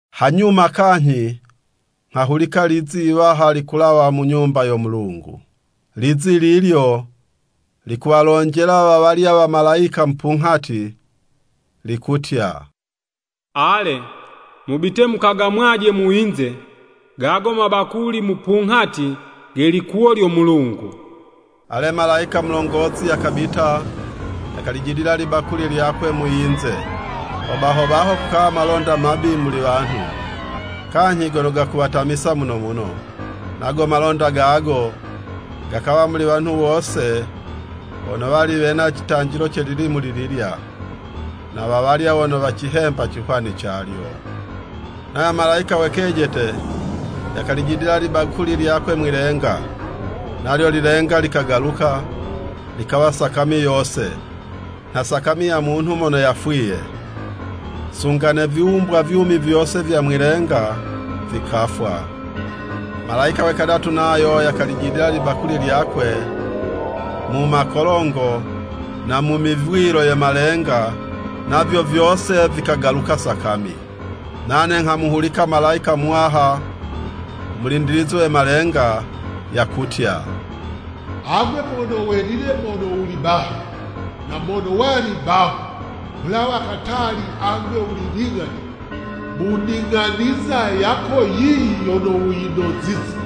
Hanyuma kanyhi nghahulika lizi yiwaha likulawa mu Nyumba yo Mulungu, lizi lilyo likuwalonjela wawalya wamalayika mupunghati, likutya, “Ale, mubite mukagamwaje mu yinze, gago mabakuli mupunghati ge likuwo lyo Mulungu.” Ale, malayika mulongozi yakabita yakalijidila libakuli lyakwe mu yinze. Ho baho baho kukawa malonda mabi muli wanhu, kanyhi gono gakuwatamisa muno muno, nago malonda gago, gakawa muli wanhu wose wono wali wena citanjilo ce lilimu lililya, na wawalya wono wacihemba cihwani calyo. Nayo malayika we kejete yakalijidila libakuli lyakwe mwi'lenga. Nalyo lilenga likagaluka, likawa sakami yose, nha sakami ya munhu mono yafwiye, sunga ne viwumbwa vyumi vyose vya mwi'lenga vikafwa. Malayika we kadatu nayo yakalijidila libakuli lyakwe mu makolongo na mu mivwilo ye malenga, navyo vyose vikagaluka sakami. Nane nghamuhulika malayika muwaha u mulindilizi we malenga, yakutya, “Agwe Mono Welile mono wuli baha, na mono wali baho kulawa katali agwe wuli ling'ani mu ning'aniza yako yiyi yono wuyinozize.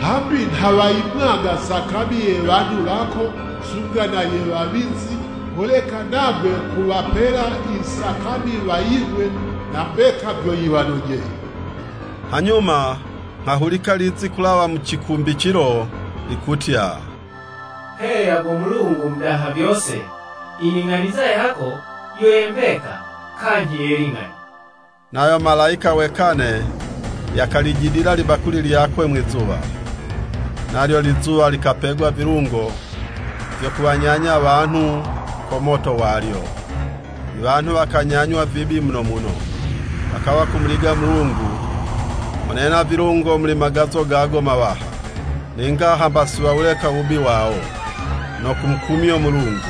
Hambi nha wayimwaga sakami ye wanhu wako, sunga na ye wawizi, holeka nagwe kuwapela i sakami waying'we, na mbeka vyo yiwanojeye!” Hanyuma nghahulika lizi kulawa mu cikumbicilo, likutya, “Heya go Mulungu u Mudaha vyose, i ning'aniza yako yo ye mbeka kanyhi ye ling'ani.” Nayo malayika we kane yakalijidila libakuli lyakwe mwizuwa. Nalyo lizuwa likapegwa vilungo vyo kuwanyanya wanhu ko moto walyo. Iwanhu wakanyanywa vibi muno muno, wakawa kumuliga Mulungu mono yena vilungo muli magazo gago mawaha. Ninga hamba si wawuleka u wubi wawo, no kumukumyo Mulungu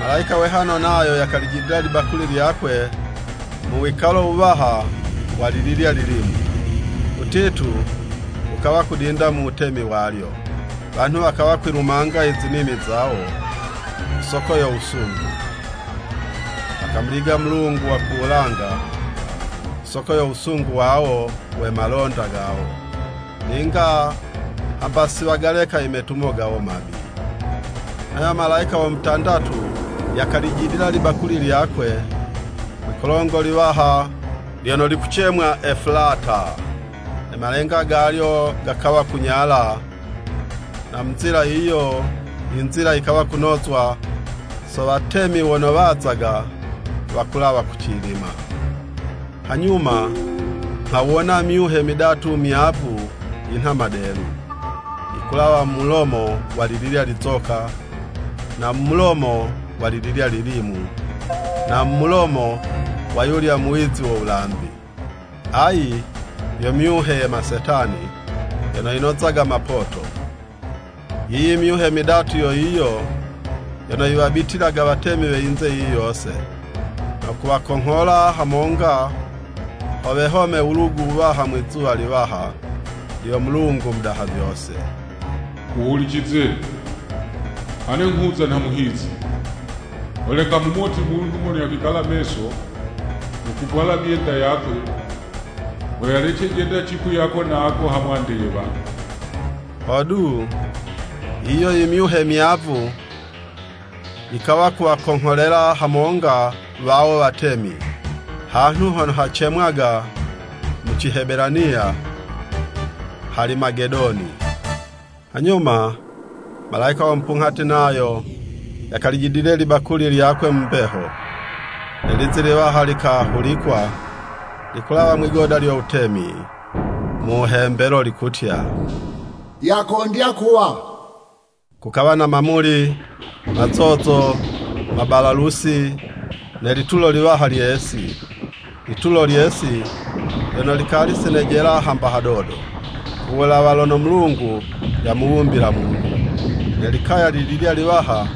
Malayika we hano nayo yakalijidila libakuli lyakwe mu wikalo wuwaha wa lililya lilimu. Uwutitu wukawa kudinda mu wutemi walyo, wanhu wakawa kwilumanga i zinimi zawo ku soko yo wusungu, wakamuliga Mulungu wa ku wulanga ku soko yo wusungu wawo we malonda gawo. Ninga hamba si wagaleka i metumo gawo mabi. Nayo Malayika wo mutandatu yakalijidila libakuli lyakwe mwikolongo liwaha lyono likucemwa Efulata. Ne malenga galyo gakawa kunyala, na mu nzila yiyo, yinzila yikawa kunozwa so watemi wono wazaga wakulawa kucilima. Hanyuma nghawona myuhe midatu myavu yinha madelu, yikulawa mu mulomo wa lililya lizoka, na mu mulomo wa lililya lilimu, na mu mulomo wa yulya muwizi wo wulambi. Ayi yo myuhe ye masetani, yono yinozaga mapoto. Yiyi myuhe midatu yo yiyo yono yiwabitilaga watemi we yinze yiyi yose, no kuwakonghola hamonga ho wehome wulugu wuwaha mwizuwa liwaha lyo Mulungu Mudaha vyose. “Wuhulicize! Ane nghuza nha muhizi! Holeka, mumoti munhu mono yakwikala meso, no kuvwala myenda yakwe, ho yalece jenda cipwi ako na ako ha mwande ye wanhu.” Hodu, yiyo imyuhe myavu yikawa kuwa kongholela hamonga wawo watemi, hanhu hono hacemwaga mu Cihebelaniya Halimagedoni. Hanyuma, malayika wo mupunghati, nayo yakalijidile libakuli lyakwe mu mbeho. Ne lizi liwaha likahulikwa, likulawa mwigoda lyo wutemi, mu wuhembelo, likutya, “Yakondya kuwa!” Kukawa na mamuli, mazozo, mabalalusi, ne litulo liwaha lye'si, litulo lye'si lyono likali si nejela hamba hadodo, ku wulawa lono Mulungu yamuwumbila munhu. Ne likaya lililye liwaha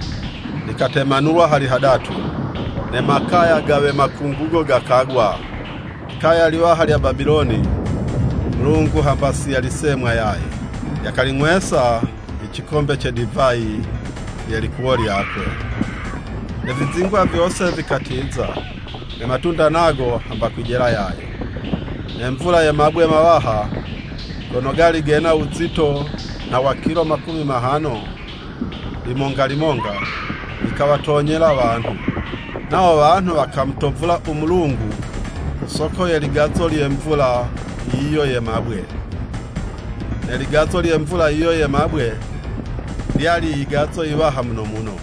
likatemanulwa hali hadatu, ne makaya ga we makungugo gakagwa. Likaya liwaha lya Babiloni, Mulungu hamba si yalisemwa yaye. Yakaling'wesa i cikombe ce divayi ye likuwo lyakwe. Ne vizingwa vyose vikatiza, ne matunda nago hamba kwijela yaye. Ne mvula ye mabwe mawaha, gono gali gena wuzito nha wa kilo makumi mahano limonga limonga, yikawatonyela wanhu. Nawo wanhu wakamutovula u Mulungu ku soko ye ligazo lye mvula yiyo ye mabwe. Ne ligazo lye mvula yiyo ye mabwe, lyali yigazo yiwaha muno muno.